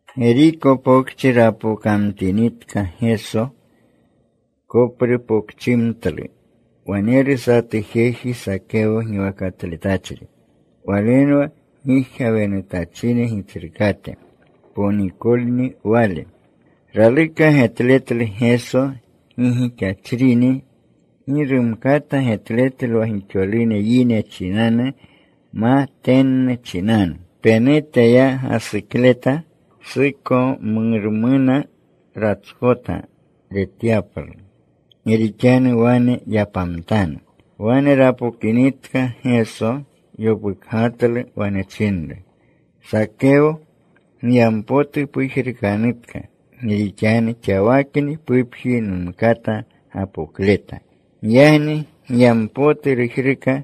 Geriko Pokchi rapokamtinitka Geso. Koprupokchimtlu. Waneru satu jeji Sakeyo giwakatletachri. Walenwa gijgawenutachine gitsrukate. Ponikolni wale. Raluka getletlu Geso gi gixachrini. Gi rumkata getletlu wa gixolune yine chinanu ma tennu chinanu. Penute ya gasukleta. Sukomormuna ratskota retyaplu. Gi rixanu wane yapamtanu. Wane rapokinitka Geso, yopukgatlu. Wane chinru, “Sakeyo, giyampotu pujrukanutka. Gi rixanu xawakni pupji numkata gapokleta.” Giyagni giyampotu rujruka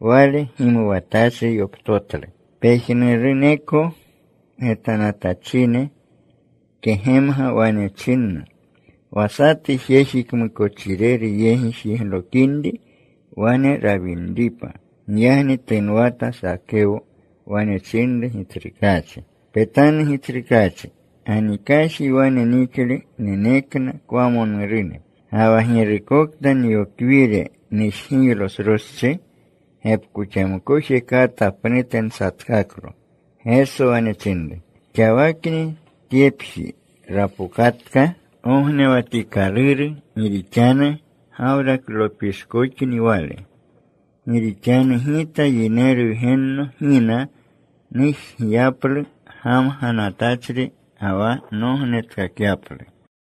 wale. Gimuwatachri yoptotlu. Pejnuruneko getanatachine kegemga. Wane chinna wa satu jeji kmukochireru yegi jiglokinri wane rawinripa. Giyagni tunwata Sakeyo. Wane chinru Gitsrukaachi, “Petanu, Gitsrukaachi. Ganikaji wane nixle nenekna kwamonurune. Ga wa girukokta nyokwire nujgiylo sroschi, gepkoxamkoje kata pnute nsatkaklo.” Geso wane chinru, “Xawakni tyepji rapokatka gognewatikaluru, gi rixanu Gawraklopishkoxni wale. Gi rixanu Gita Yineru Wgenno gina nujgiyaplu gamganatachri ga wa nognetkakyaplu.”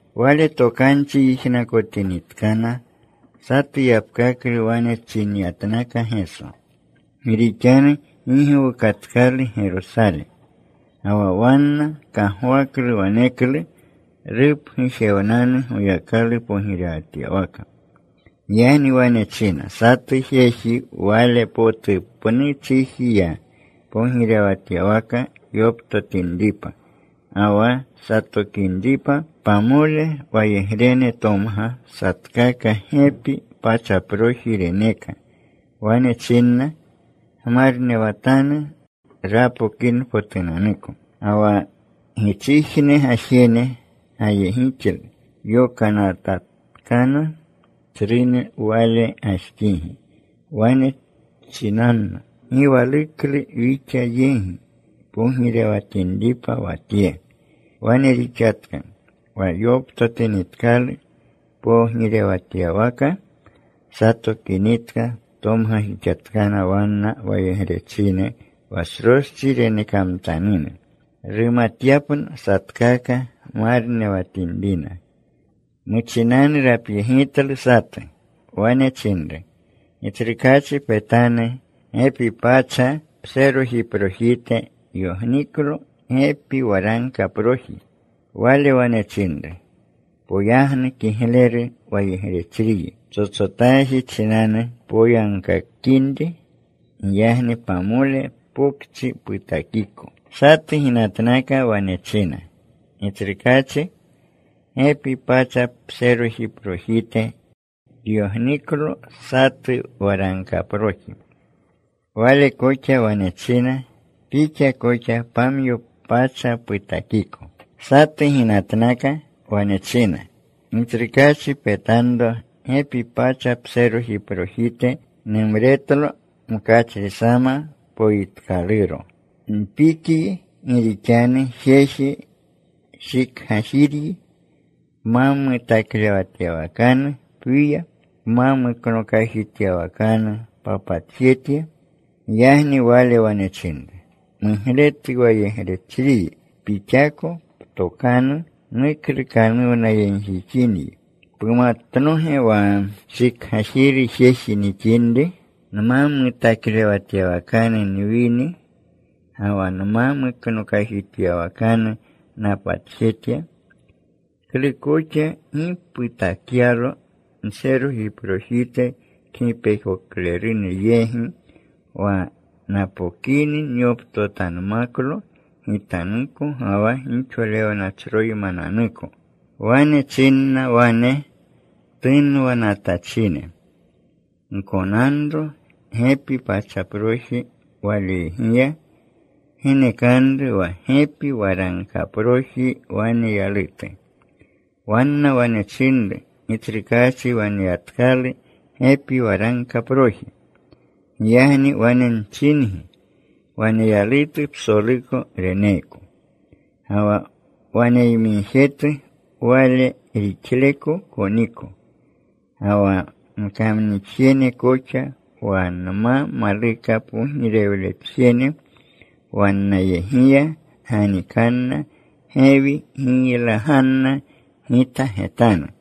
Wale tokanchi yijnakotinitkana, satu yapkaklu wane chinyatnakna Geso, gi rixanu gi gowukatkalu Gerosale, ga wa wanna kagwaklu waneklu rupgujewnanu Goyakalu pogirewatyawaka. Giyagni wane china, “Satu jeji wale potu pnu chiji ya, pogirewatyawaka yoptotinripa ga wa satokinripa. Pamole wayegrene tomga. Satkaka gepi pachaproji reneka. Wane chinna, ‘Gmarnewatanu napokinpotunanuko.’ “Ga wa gichijne gajene gayegixlu. Yokanatkana tsrune wale gajxigi, wane chinanna, ‘Gi waluklu wixa yegi pogirewatinripa wa tye.’ “Wane rixatka. Wa yoptotinitkalu pogirewatyawaka. Satokinitka tomgajixatkana wanna wayegrechine wa sroschi renekamtanune, rumatyapna satkaka marnewatinrina. “Muchinanu rapyegitlu satu. Wane chinru, ‘Gitsrukaachi, petanu. Gepi pacha pserojiprojite yogniklo gepi waragkaproji.’ “Wale wane chinru, ‘Poyagnu, kigleru wayegrechriyi. Ptsotsotaji chinanu poyagkakinri. Giyagni pamole pokchi putakiko.’ “Satu ginatnaka. Wane china, ‘Gitsrukaachi, gepi pacha pserojiprojite tyogniklo satu waragkaproji.’ “Wale koxa wane china, ‘Pixa koxa pamyo pokchi putakiko.’ “Satu ginatnaka. Wane china, ‘Gitsrukaachi, petanro gepi pacha pserojiprojite. Numretlo mkachrisama poyitkaluro. Npikyi. Gi rixanu jeji shikgajiryi. Pma mutaklewatyawakanu pwiya. Pma muknokajityawakanu papatjetya.’ “Giyagni wale wane chinru, ‘Mugletu wayegrechriyi. Pixako ptokanu nuklukanuwnayegjixinyi. ¿Pumatnoge wa shikgajiru jeji nixinri? ¿Nma mutaklewatyawakanu nwini, ga wa nma muknokajityawakanu napatjetya? ¿Klu koxa gi putakyalo nserojiprojite kgipekoklerune yegi, wa napokini nyoptotanmaklo gitanuko ga wa gixolewnachroymananuko?’ “Wane chinna wane tunwanatachine, ‘Gkonanro gepi pachaproji waleyegiya. Genekanru wa gepi waragkaproji waneyalutu.’ “Wanna wane chinru, ‘Gitsrukaachi, waneyatkalu gepi waragkaproji.’ “Giyagni wane nchingi, waneyalutu psoluko reneeko. Ga wa waneyamigjetu, wane rixleko koniko. Ga wa nkamnixjene koxa wa nma maluka pogirewletjene wannayegiya, ganikanna gewi. Giylaganna gita getanu.”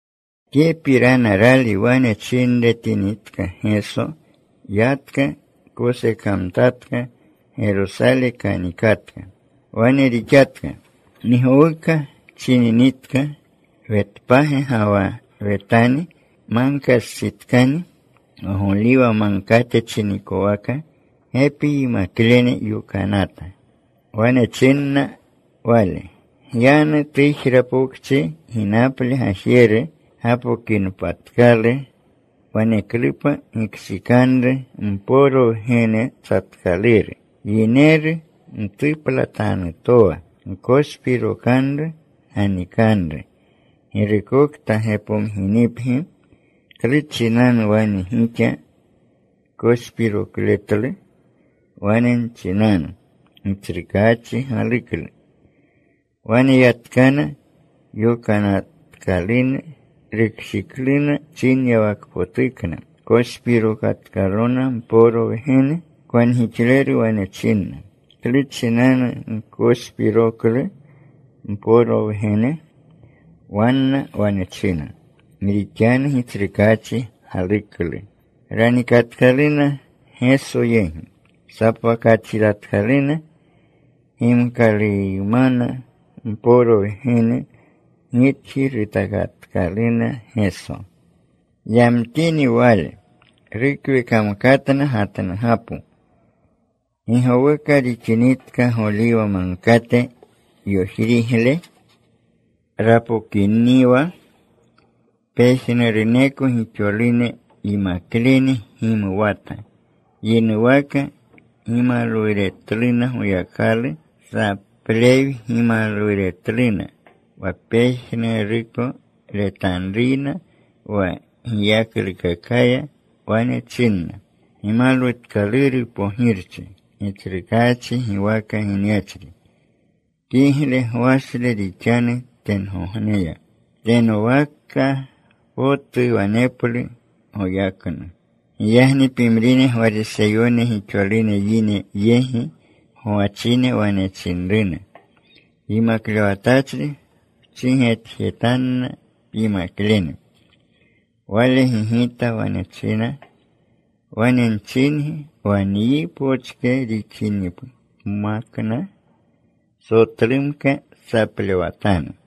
Tyepirana rali wane chinremtinitka Geso, yatka. Kosekamtatka. Gerosale kanikatka. Wane rixatka. Gi gowuka chininitka Wetpage ga wa Wetani. Magkastsitkani, wa Goliwa Magkate chinikowaka. Gepi yimaklene yokanata. Wane chinna Wale, “Gyanu tujra pokchi ginaple gajeru. Gapokinpatklu, waneklupa gikshikanro mporo wgene tsatkaluru, yineru mtuplatanutowa. Gkoshrikanru. Ganikanru. Girukokta gepomginipgi, ‘¿Klu chinanu wane gixa koshpirokletlo?’ wane nchinanu, ‘Gitsrukaachi galuklu.’” Wane yatkana yokanatkalune. Rukshikluna chinyawakpotukna. Koshpirokatkaluna mporo wgene. Kwangixleru wane chinna, “¿Klu chinanu gkoshpiroklu mporo wgene?” Wanna wane china, “Gi rixanu Gitsrukaachi galuklu.” Ranikatkaluna Geso yegi. Sapwakatjitatkaluna gimkaluymana mporo wgene. Gitji rutakatkaluna Geso. Yamtini Wale, rukwekamkatna gatnugapo. Gi gowuka rixininitka, Goliwa Magkate yojrigle rapokiniwa, pejnuruneko gixolune yimaklene gimuwata. Yinuwaka gimalwuretluna Goyakalu. Saplee gimalwuretluna wa pejnuruko retanruyna, wa giyaklukakaya. Wane chinna: ¡Gimalwutkaluru Pogirchi, Gitsrukaachi giwaka ginyachri! ¡Kigle gwashle rixanu tengogneya! ¡Tenowaka potu waneplu goyaknu! Giyagni pimrine Gwariseyone gixolune yine yegi gwachine wane chinruna, “Yimaklewatachri, pchigetjetanna pyimaklene.” Wale gigita. Wane china, “Wane nchingi, wa nyi pochke rixinmakna, sotlumka saplewatanu.”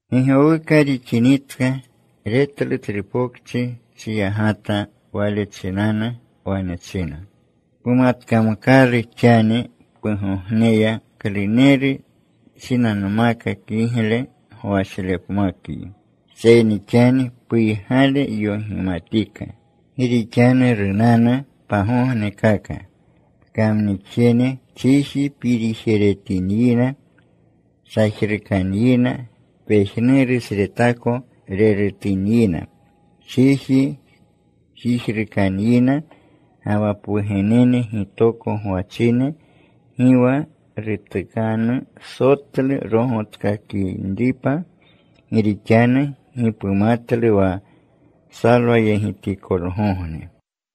Gi gowuka tixininitka, retlu tsru pokchi. Chiyagata wale chinanu. Wane china, “¡Pumatkamkalu xani pugogneya, kluneru chinanmaka kigle gwashlepmakyi! Seyni xani puygale yogimatika. Gi rixanu runanu pagognekaka, pkamnixjene chiji pirijeretinyina. Sajrukanyina. Pejnurusretako rerutanyina. Chiji jijrukanyina, ga wa pwugenene gitoko gwachine. Gi wa rutukanu sotlu rogotkakinripa, gi rixanu gi pumatlu wa psalwayegitikolgogne.”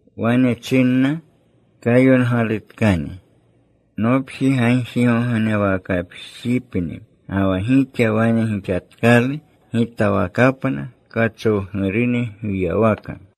Wane chinna, “Kayongalutkani: Nopji gagjigognewakapjipni. Ga wa gixa wane gixatkalu gitawakapna kachowgurune gwiywaka.”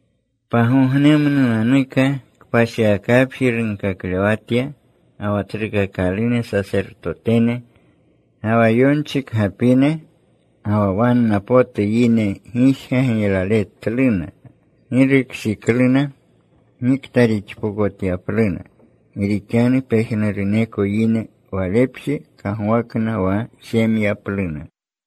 Pagognemnunanuka kpashiwakapji runkaklewatya. Ga wa tsrukakalune sasertotene ga wa yonchikgapine, ga wa wanna potu yine gijga giylaletluna. Gi rukshikluna gikta rixpokotyapluna. Gi rixanu pejnuruneko yine Walepje kagwakna wa jemyapluna.